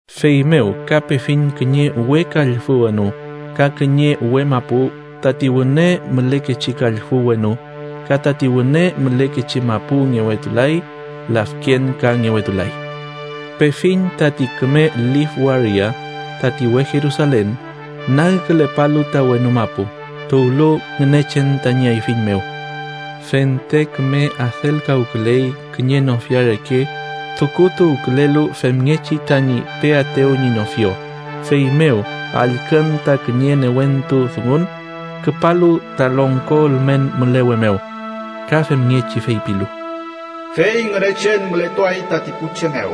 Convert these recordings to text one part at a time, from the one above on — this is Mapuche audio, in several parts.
Feymew ka pefiñ kiñe we kallfü wenu ka kiñe we mapu. Tati wüne mülekechi kallfü wenu ka tati wüne mülekechi mapu ngewetulay, lafken ka ngewetulay. Pefiñ tati küme lif waria, tati we Jerusalen, nagkülepalu ta wenu mapu, tuwlu Ngünechen tañi ayfiñ mew. Fente küme adelkawküley kiñe nofia reke tukutuwkülelu femngechi tañi peaetew ñi nofio. Feymew allkün ta kiñe newentu dungun küpalu ta longko ülmen mülewe mew, ka femngechi feypilu: “Fey Ngünechen mületuay tati pu che mew.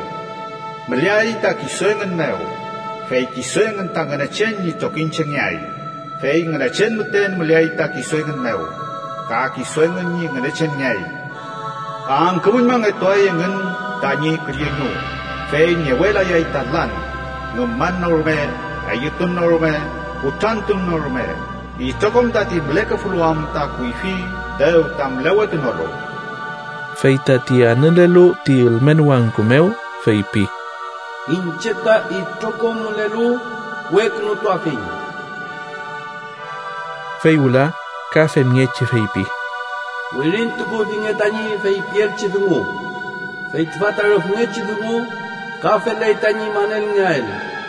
Müleay ta kisu engün mew, fey kisu engün ta Ngünechen ñi trokiñchengeay, fey Ngünechen müten müleay ta kisu engün mew, ka kisu engün ñi Ngünechenngeay. Angkümüñmangetuay engün tañi külleñu, fey ngewelayay ta lan, ngüman no rume, eyütun no rume, kutrantun no rume. Itrokom tati mülekefulu am ta kuyfi dew ta mülewetunolu.” Fey tati anülelu ti ülmen wangku mew feypi: “Iñche ta itrokom mülelu wekünutuafiñ.” Fey wüla ka femngechi feypi: “Wirintukufinge tañi feypiaelchi dungu, fey tüfa ta rüfngechi dungu ka feley tañi manelngeael.”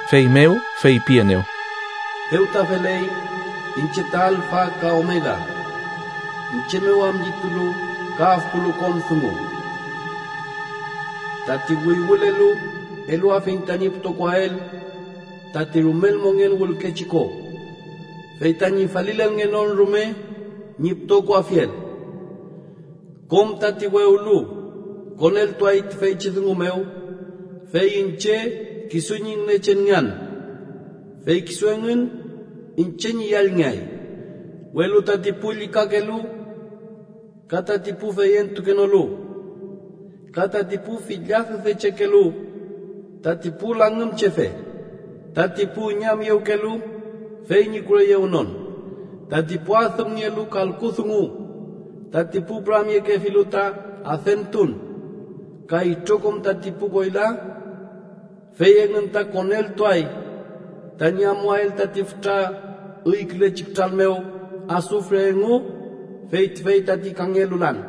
Feymew feypienew: “Dew ta feley. Iñche ta alfa ka omega, iñche mew am llitulu ka afpulu kom dungu. Tati wüywülelu eluafiñ tañi pütokoael tati rumel mongen wülkechi ko, fey tañi falilelngenon rume ñi pütokoafiel. Kom tati wewlu koneltuay tüfeychi dungu mew, fey iñche kisu ñi Ngünechenngean, fey kisu engün iñche ñi yallngeay. Welu tati pu llükakelu ka tati pu feyentukenolu, ka tati pu fillad üdechekelu, tati pu langümchefe, tati pu üñamyewkelu fey ñi kureyewnon, tati pu adümnielu kalku dungu, tati pu püramyekefilu ta adentun, ka itrokom tati pu koyla, fey engün ta koneltuay tañi amuael tati fütra üykülechi kütral mew asufre engu, fey tüfey tati kangelu lan.”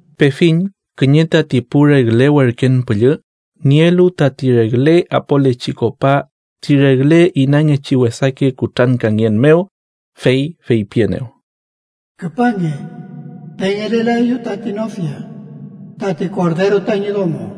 Pefiñ kiñe tati pu regle werken püllü nielu tati regle apolechi kopa ti regle inangechi wesake kutrankangen mew, fey feypienew: “Küpange, pengelelaeyu tati nofia, tati Korderu tañi domo.”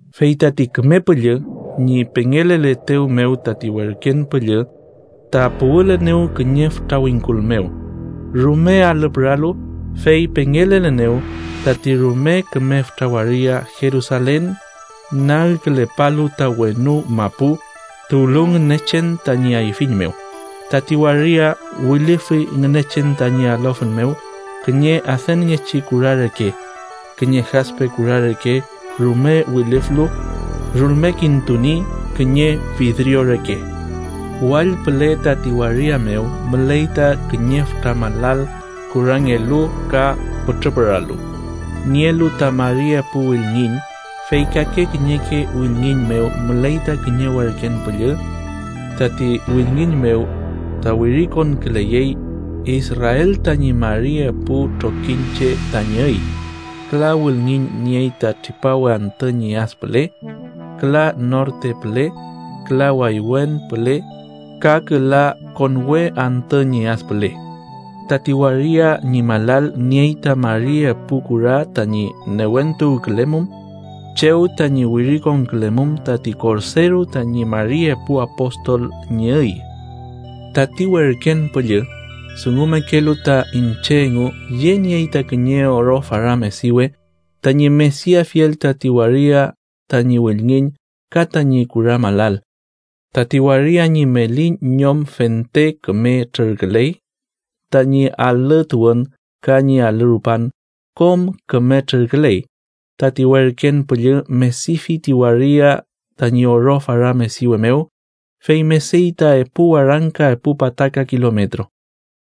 Fey tati Küme Püllü ñi pengeleletew mew, tati werken püllü ta puwülenew kiñe fütra wingkul mew, rume alü püralu, fey pengelelenew tati rume küme fütra waria Jerusalen, nagkülepalu ta wenu mapu, tuwlu Ngünechen tañi ayfiñ mew. Tati waria wilüfi Ngünechen tañi alofün mew, kiñe adünngechi kura reke, kiñe Jaspe kura reke rume wilüflu, rulmekintuni kiñe fidrio reke. Wall püle tati waria mew müley ta kiñe fütra malal kurangelu ka pütrü püralu, nielu ta mari epu wülngiñ, fey kake kiñeke wülngiñ mew müley ta kiñe werken püllü. Tati wülngiñ mew ta wirikonküleyey Israel tañi mari epu trokiñche tañi üy. Küla wülngiñ niey ta tripawe antü ñi ad püle, küla norte püle, küla waywen püle ka küla konwe antü ñi ad püle. Tati waria ñi malal niey ta mari epu kura tañi newentuwkülemum, chew tañi wirikonkülemum tati Korderu tañi mari epu apostol ñi üy. Tati werken püllü dungumekelu ta iñche engu yeniey ta kiñe oro fara mediwe tañi mediafiel tati waria tañi wülngiñ ka tañi kura malal. Tati waria ñi meli ñom fente küme trürküley. Tañi alü tuwün ka ñi alü rupan kom küme trürküley. Tati werken püllü medifi ti waria tañi oro fara mediwe mew. Fey mediy ta epu warangka epu pataka kilometro.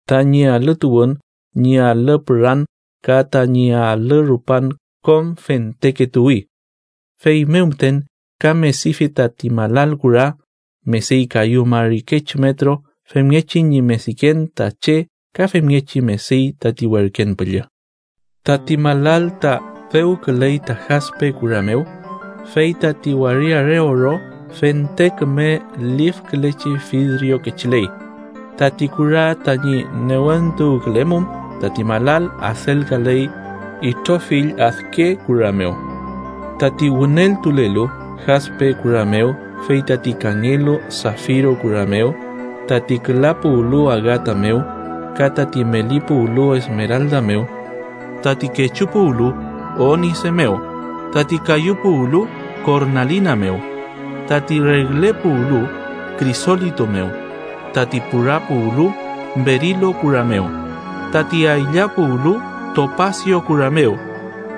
Tañi alü tuwün, ñi alü püran ka tañi alü rupan kom fenteke tuwi. Feymew müten ka medifi tati malal kura: mediy kayu mari kechu metro, femngechi ñi mediken ta che ka femngechi mediy tati werken püllü. Tati malal ta dewküley ta kaspe kura mew, fey tati waria re oro, fente küme lifkülechi fidrio kechiley. Tati kura tañi newentuwkülemum tati malal adelkaley itrofill adke kura mew: tati wüneltulelu, kaspe kura mew; fey tati kangelu, safiro kura mew; tati küla puwlu, agata mew; ka tati meli puwlu, esmeralda mew; tati kechu puwlu, onise mew; tati kayu puwlu, kornalina mew; tati regle puwlu, krisolito mew; tati pura puwlu, berilo kura mew; tati aylla puwlu, topasio kura mew;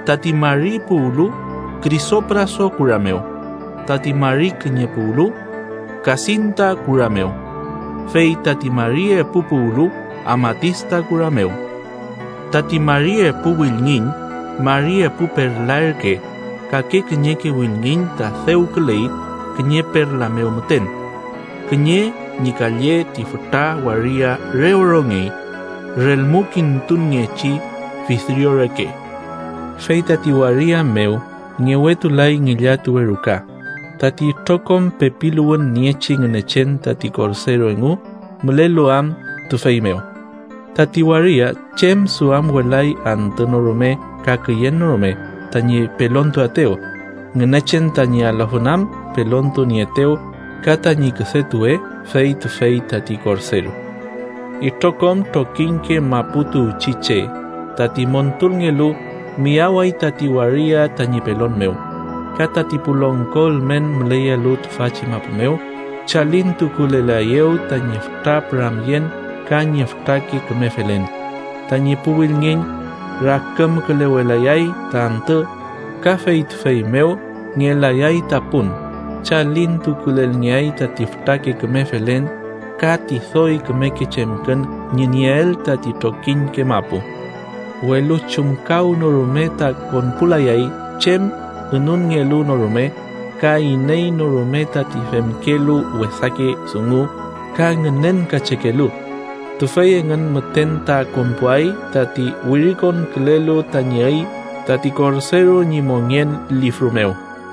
tati mari puwlu, krisopraso kura mew; tati mari kiñe puwlu, kasintu kura mew; fey tati mari epu puwlu, amatista kura mew. Tati mari epu wülngiñ mari epu perla ürke. Kake kiñeke wülngiñ ta dewküley kiñe perla mew müten. Kiñe ñi kalle tati fütra waria re orongey, rulmekintunngechi fidrio reke. Fey tati waria mew ngewetulay ngillatuwe ruka, tati itrokom pepiluwün niechi Ngünechen tati Korderu engu mülelu am tüfey mew. Tati waria chem duamwelay antü no rume ka küyen no rume tañi pelontuaetew, Ngünechen tañi alofün am pelontunieetew, ka tañi küdetuwe fey tüfey tati Korderu. Itrokom trokiñke mapu tuwchi che tati montulngelu miyaway tati waria tañi pelon mew, ka tati pu longko ülmen müleyelu tüfachi mapu mew chalintukulelaeyew tañi fütra püramyen ka ñi fütrake küme felen. Tañi pu wülngiñ rakümkülewelayay ta antü, ka fey tüfey mew ngelayay ta pun. Chalintukulelngeay tati fütrake küme felen ka ti doy kümeke chemkün ñi nieel tati trokiñke mapu. Welu chumkawnorume ta konpulayay chem ünunngelu no rume, ka iney no rume tati femkelu wesake dungu ka ngünenkachekelu. Tüfey engün müten ta konpuay tati wirikonkülelu tañi üy tati Korderu ñi mongen lifru mew.